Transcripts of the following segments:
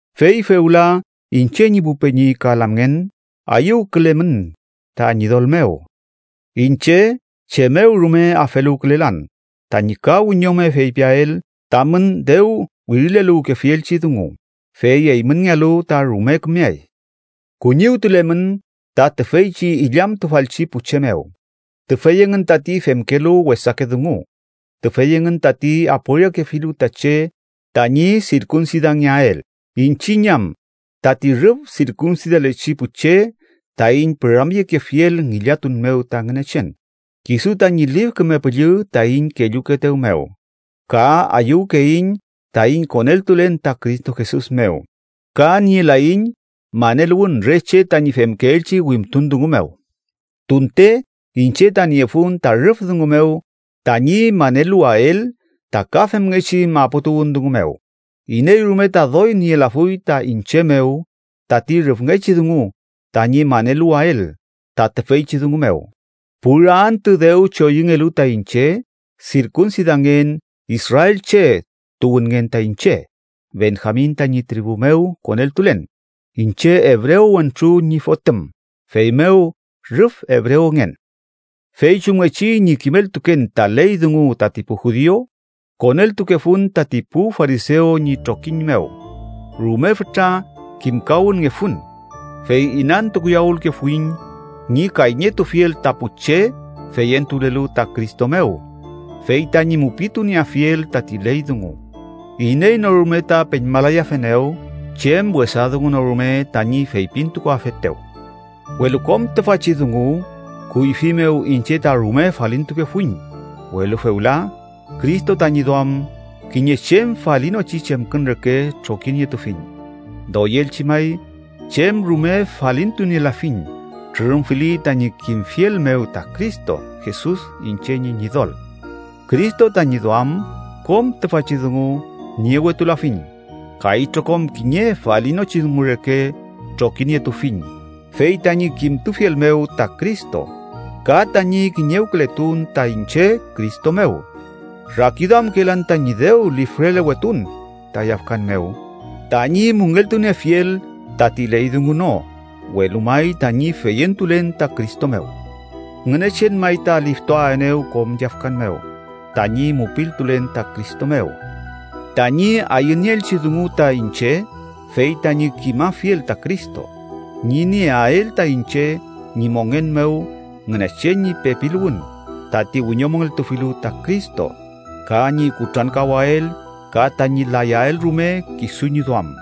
Fey fewla, iñche ñi pu peñi ka lamngen, ayüwkülemün ta Ñidol mew. Iñche chem mew rume afeluwkülelan tañi ka wiñome feypiael tamün dew wirileluwkefielchi dungu, fey eymünngealu ta rume kümeay. Kuñiwtulemün ta tüfeychi illamtufalchi pu che mew, tüfey engün tati femkelu wesake dungu, tüfey engün tati aporiakefilu ta che tañi sirkunsidangeael, iñchiñ am tati rüf sirkunsidalechi pu che, taiñ püramyekefiel ngillatun mew ta Ngünechen kisu tañi Lif Küme Püllü taiñ kellukeetew mew, ka ayüwkeiñ taiñ koneltulen ta Cristo Jesus mew, ka nielaiñ maneluwün re che tañi femkeelchi wimtun dungu mew. Tunte iñche ta niefun ta rüf dungu mew tañi maneluwael ta ka femngechi maputuwün dungu mew. Iney rume ta doy nielafuy ta iñche mew tati rüfngechi dungu tañi maneluwael ta tüfeychi dungu mew: pura antü dew choyüngelu ta iñche sirkunsidangen israelche tuwünngen ta iñche, Benjamin tañi tribu mew koneltulen, iñche ebrew wentru ñi fotüm, feymew rüf ebrewngen. Fey chumngechi ñi kimeltuken ta ley dungu tati pu judiu, koneltukefun tati pu farisew ñi trokiñ mew, rume fütra kimkawünngefun, fey inantukuyawülkefuiñ ñi kayñetufiel ta pu che feyentulelu ta Cristo mew. Fey tañi mupitunieafiel tati ley dungu, iney no rume ta peñmalayafenew chem wesa dungu no rume tañi feypintukuafetew. Welu kom tüfachi dungu, kuyfi mew iñche ta rume falintukefuiñ, welu fewla, Cristo tañi duam, kiñe chem falinochi chemkün reke trokinietufiñ. Doyelchi may, chem rume falintunielafiñ trürümfili tañi kimfiel mew ta Cristo Jesus iñche ñi Ñidol. Cristo tañi duam kom tüfachi dungu niewetulafiñ ka itrokom kiñe falinochi dungu reke trokinietufiñ fey tañi kimtufiel mew ta Cristo ka tañi kiñewkületun ta iñche Cristo mew. Rakiduamkelan tañi dew lifrelewetun ta yafkan mew tañi müngeltuniefiel tati ley dungu no, welu may tañi feyentulen ta Cristo mew. Ngünechen may ta liftuaenew kom yafkan mew tañi mupiltulen ta Cristo mew. Tañi ayünieelchi dungu ta iñche fey tañi kimafiel ta Cristo, ñi nieael ta iñche ñi mongen mew Ngünechen ñi pepiluwün tati wiñomongeltufilu ta Cristo, ka ñi kutrankawael ka tañi layael rume kisu ñi duam.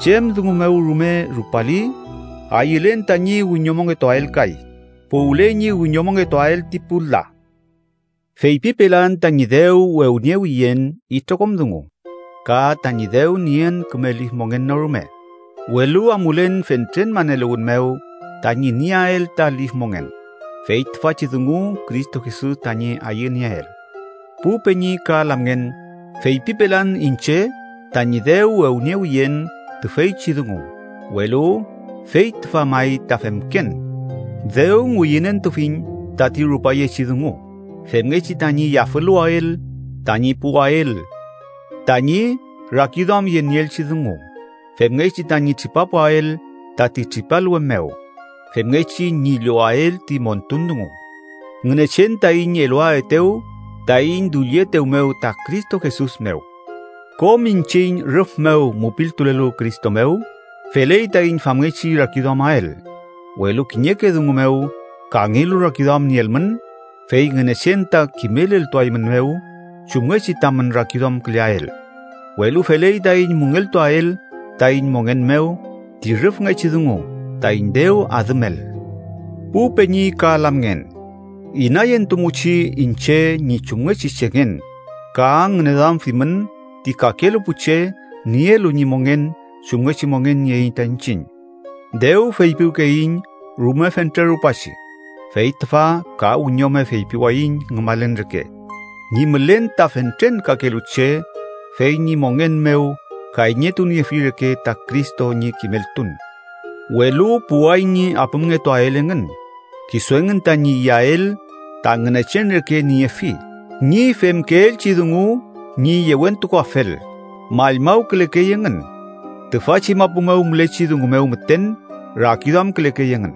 Chem dungu mew rume rupali, ayülen tañi wiñomongetuael kay puwle ñi wiñomongetuael ti pu la. Feypipelan tañi dew wewniewiyen itrokom dungu, ka tañi dew nien küme lif mongen no rume, welu amulen fentren maneluwün mew tañi nieael ta lif mongen, fey tüfachi dungu Cristo Jesus tañi ayünieel. Pu peñi ka lamngen, feypipelan iñche tañi dew wewniewiyen tüfeychi dungu, welu fey tüfa may ta femken, dew ngüyünentufiñ tati rupayechi dungu femngechi tañi yafüluwael tañi puwael tañi rakiduamyenieelchi dungu, femngechi tañi tripapuael tati tripalwe mew femngechi ñi llowael ti montun dungu Ngünechen taiñ eluaetew taiñ dullietew mew ta Cristo Jesus mew. Kom iñchiñ, rüf mew mupiltulelu Cristo mew, feley taiñ famngechi rakiduamael. Welu kiñeke dungu mew kangelu rakiduam nielmün, fey Ngünechen ta kimeleltuaeymünmew chumngechi tamün rakiduamküleael. Welu feley taiñ müngeltuael taiñ mongen mew ti rüfngechi dungu taiñ dew adümel. Pu peñi ka lamngen, inayentumuchi iñche ñi chumngechi chengen ka ngüneduamfimün ti kakelu pu che nielu ñi mongen chumngechi mongen nieiñ ta iñchiñ. Dew feypiwkeyiñ rume fentre rupachi, fey tüfa ka wiñome feypiwayiñ ngümalen reke, ñi mülen ta fentren kakelu che fey ñi mongen mew kayñetuniefi reke ta Cristo ñi kimeltun. Welu puway ñi apümngetuael engün, kisu engün tañi iyael ta ngünechen reke niefi. Ñi femkeelchi dungu ñi yewentukuafel, mallmawkülekey engün. Tüfachi mapu mew mülechi dungu mew müten rakiduamkülekey engün.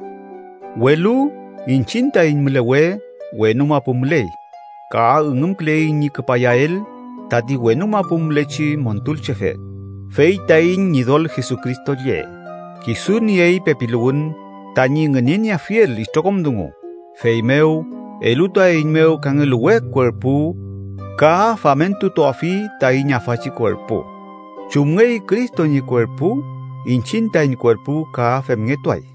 Welu iñchiñ taiñ mülewe wenu mapu müley, ka üngümküleiñ ñi küpayael tati wenu mapu mülechi Montulchefe, fey taiñ Ñidol Jesucristo lle. Kisu niey pepiluwün tañi ngünenieafiel itrokom dungu, feymew elutuaeiñmew kangelu we kuerpu ka famentutuafi taiñ afachi kuerpu. Chumngey Cristo ñi kuerpu, iñchiñ taiñ kuerpu ka femngetuay.